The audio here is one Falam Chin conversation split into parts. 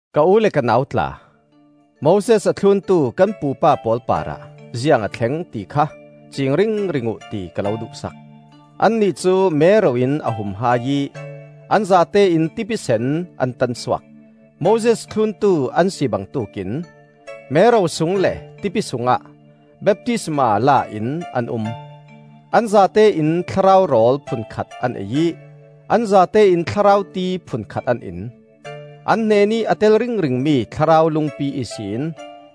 Ka u le ka nau tla, Moses a thluntu kan pupa pawl parah ziang a thleng, ti kha ciing ringring uh, ti ka lo duh sak. Annih cu mero in a hum hai ih an zatein Tipi Sen an tansuak. Moses thluntu an si bangtuk in mero sung le tipi sungah baptisma la in an um. An zatein thlarau rawl phunkhat an ei ih, an zatein thlarau ti phunkhat an in. An hnenih a tel ringringmi thlarau lungpi ihsin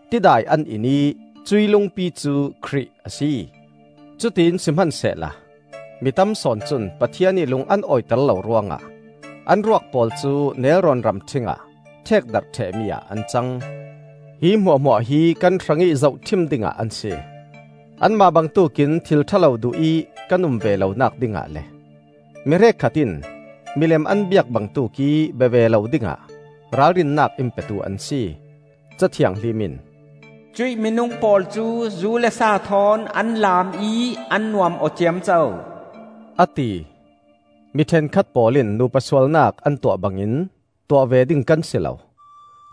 tidai an in ih cuih lungpi cu Khrih a si. Cutiin sihmansehla mi tam sawn cun Pathian ih lung an awiter lo ruangah an ruak pawl cu nelrawn ramṭhing ah ṭhekdarh ṭhehmi ah an cang. Hi hmuahhmuah hi kan hrangih zohṭhim dingah an si: Anmah bangtuk in thil ṭha lo duhih kan um ve lonak dingah le, mihrek khat in milem an biak bangtuk ih bia ve lo dingah ralrinnak in petu an si. Ca Thianghlim in, “Cuih minung pawl cu zu le sa thawn an laam ih an nuam aw ciamco,” a ti. Mi ṭhenkhat pawl in nupa sualnak an tuah bangin tuah ve ding kan si lo;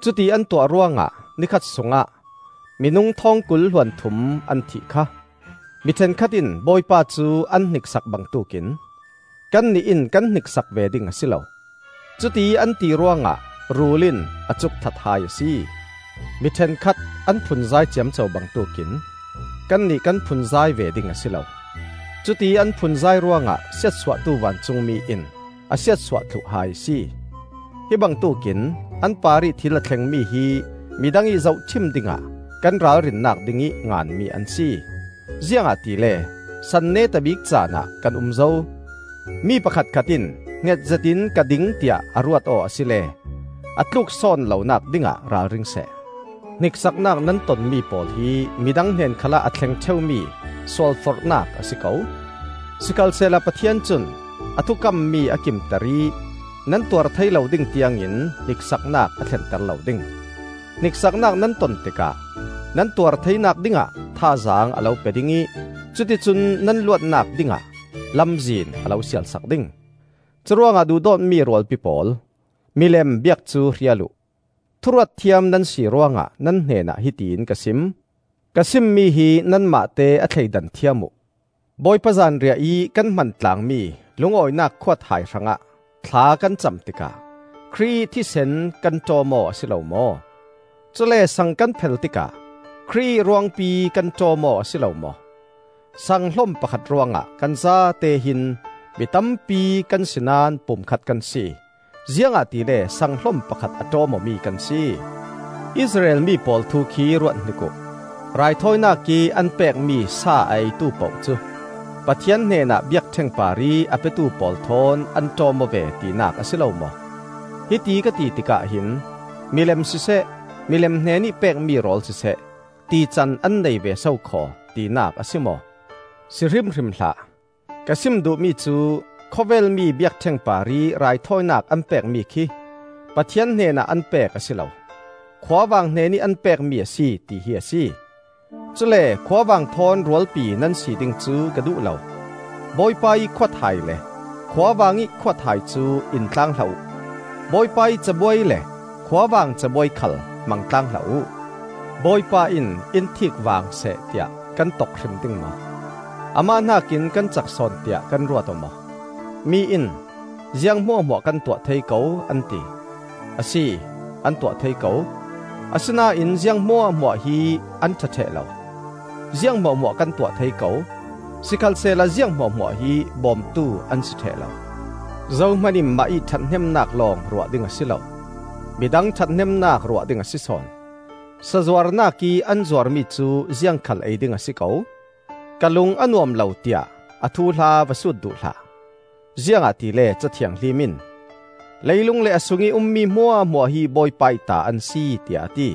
cuti an tuah ruangah ni khat sungah minung thawngkul hluanthum an thih kha! Mi ṭhenkhat in Bawipa cu an hniksak bangtuk in kannih in kan hniksak ve ding a si lo; cutiih an ti ruangah rul in a cuk that hai a si. Mi ṭhenkhat an phunzai ciamco bangtuk in kannih kan phunzai ve ding a si lo; cutiih an phunzai ruangah Siatsuahtu Vancungmi in a siatsuah thluh hai a si. Hi bangtuk in an parih thil a thlengmi hi midang ih zohṭhim dingah kan ralrinnak dingih nganmi an si. Ziangahtile san neta bik caanah kan um zo. Mi pakhatkhat in hngetzet in ka ding tiah a ruat aw asile a tluksawn lonak dingah ralring seh. Hniksaknak nan tonmi pawl hi midang hnen khalah a thleng ṭheumi sualforhnak a si ko. Sikhalsehla Pathian cun a thukammi a kimter ih nan tuar thei lo ding tiangin hniksaknak a thlenter lo ding. Hniksaknak nan ton tikah nan tuar theinak dingah thazaang a lo pe ding ih cuticun nan luatnak dingah lamzin a lo sial sak ding. Curuangah duhdawtmi rualpi pawl, milem biak cu hrial uh. Thu ruatthiam nan si ruangah nan hnenah hiti in ka sim. Ka sim mi hi nanmahte a thleidan thiam uh. Bawipa Zanriah ih kan hman tlaangmi lungawinak khuathai hrangah thla kan cam tikah Khrih ih thisen kan ṭawm-aw a si lo maw? Cule sang kan phel tikah Khrih ih ruangpi kan ṭawm-aw a si lo maw? Sanghlom pakhat ruangah kan zate hin mi tampi kan si naón pumkhat kan si, ziangahtile sanghlom pakhat a ṭawm awmi kan si. Israel mi pawl thu khi ruat hnik uh: raithawinak ih an pekmi sa a eitu poh cu Pathian hnenah biakṭheng parih a petu pawl thawn an ṭawm-aw ve tinak a si lo maw? Hiti ka ti tikah hin milem siseh, milem hnenih pekmi rawl siseh, tican an nei ve sokhaw tinak a si maw? Si hrimhrim hlah! Ka sim duhmi cu: khawvel mi biakṭheng parih raithawinak an pekmi khi Pathian hnenah an pek a si lo, khuavang hnenih an pekmi a si, tihi a si. Cule khuavang thawn rualpi nan si ding cu ka duh lo. Bawipa ih khuathai le khuavang ih khuathai cu intlaang hlah uh. Bawipa ih cabuai le khuavang cabuai khal hmang tlaang hlah uh. Bawipa in in thiik vaang seh tiah kan tok hrim ding maw? Amah hnakin kan cak sawn tiah kan ruat-aw maw? Mi in, “Ziang hmuahhmuah kan tuah thei ko,” an ti. Asi, an tuah thei ko; asinain ziang hmuahhmuah hi an ṭha ṭheh lo. “Ziang hmuahhmuah kan tuah thei ko,” sikhalsehla ziang hmuahhmuah hi bawmtu an si ṭheh lo. Zohman in mah ih ṭhathnemnak lawng ruah ding a si lo; midang ṭhathnemnak ruah ding a si sawn. Sazuarnak ih an zuarmi cu ziangkhal ei ding a si ko; ka lung a nuam lo, tiah a thuhla va sut duh hlah. Ziangahtile Ca Thianghlim in, “Leilung le a sungih um hmuahhmuah hi Bawipa ih ta an si,” tiah a ti.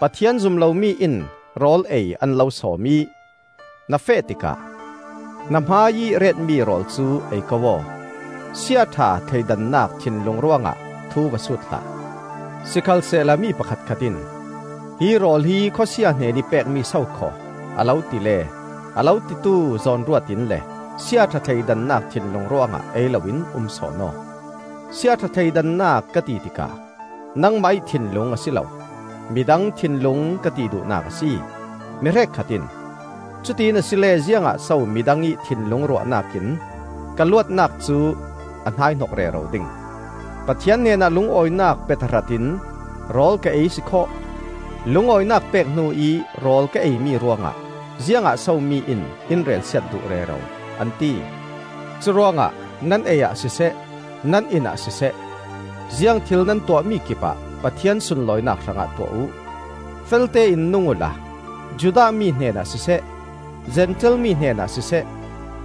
Pathian zum lomi in rawl ei an lo sawm ih na feh tikah na hmaiih retmi rawl cu ei ko aw; siaṭha thleidannak thinlung ruangah thu va sut hlah. Sikhalsehla mi pakhatkhat in, “Hi rawl hi khawsia hnenih pekmi sokhaw,” a lo ti le a lo titu zawnruat in le siaṭha thleidannak thinlung ruangah ei loin um sawn aw. Sia ṭha thleidannak ka ti tikah nangmah ih thinlung a si lo; midang thinlung ka ti duhnak a si. Mi hrekkhat in, “Cutiin asile ziangah so midang ih thinlung ruahnak in ka luatnak cu a hnaihnok rero ding? Pathian hnenah lungawinak pe tahrat in rawl ka ei sikhawh, lungawinak pek hnu ih rawl ka eimi ruangah ziangah so mi in in relsiat duh rero?” an ti. Curuangah nan ei ah siseh, nan in ah siseh, ziangthil nan tuahmi kipah Pathian sunlawinak hrangah tuah uh. Feltein nung uhla Judah mi hnenah siseh, Zentail mi hnenah siseh,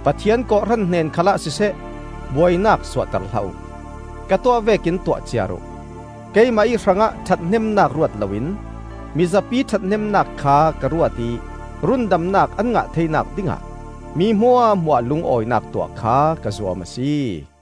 Pathian kawhhran hnen khalah siseh, buainak suahter hlah uh. Ka tuah vekin tuah ciar uh. Keimah ih hrangah ṭhathnemnak ruat loin mizapi ṭhathnemnak kha ka ruat ih rundamnak an ngah theinak dingah mi hmuahhmuah lungawinak tuah kha ka zuam a si.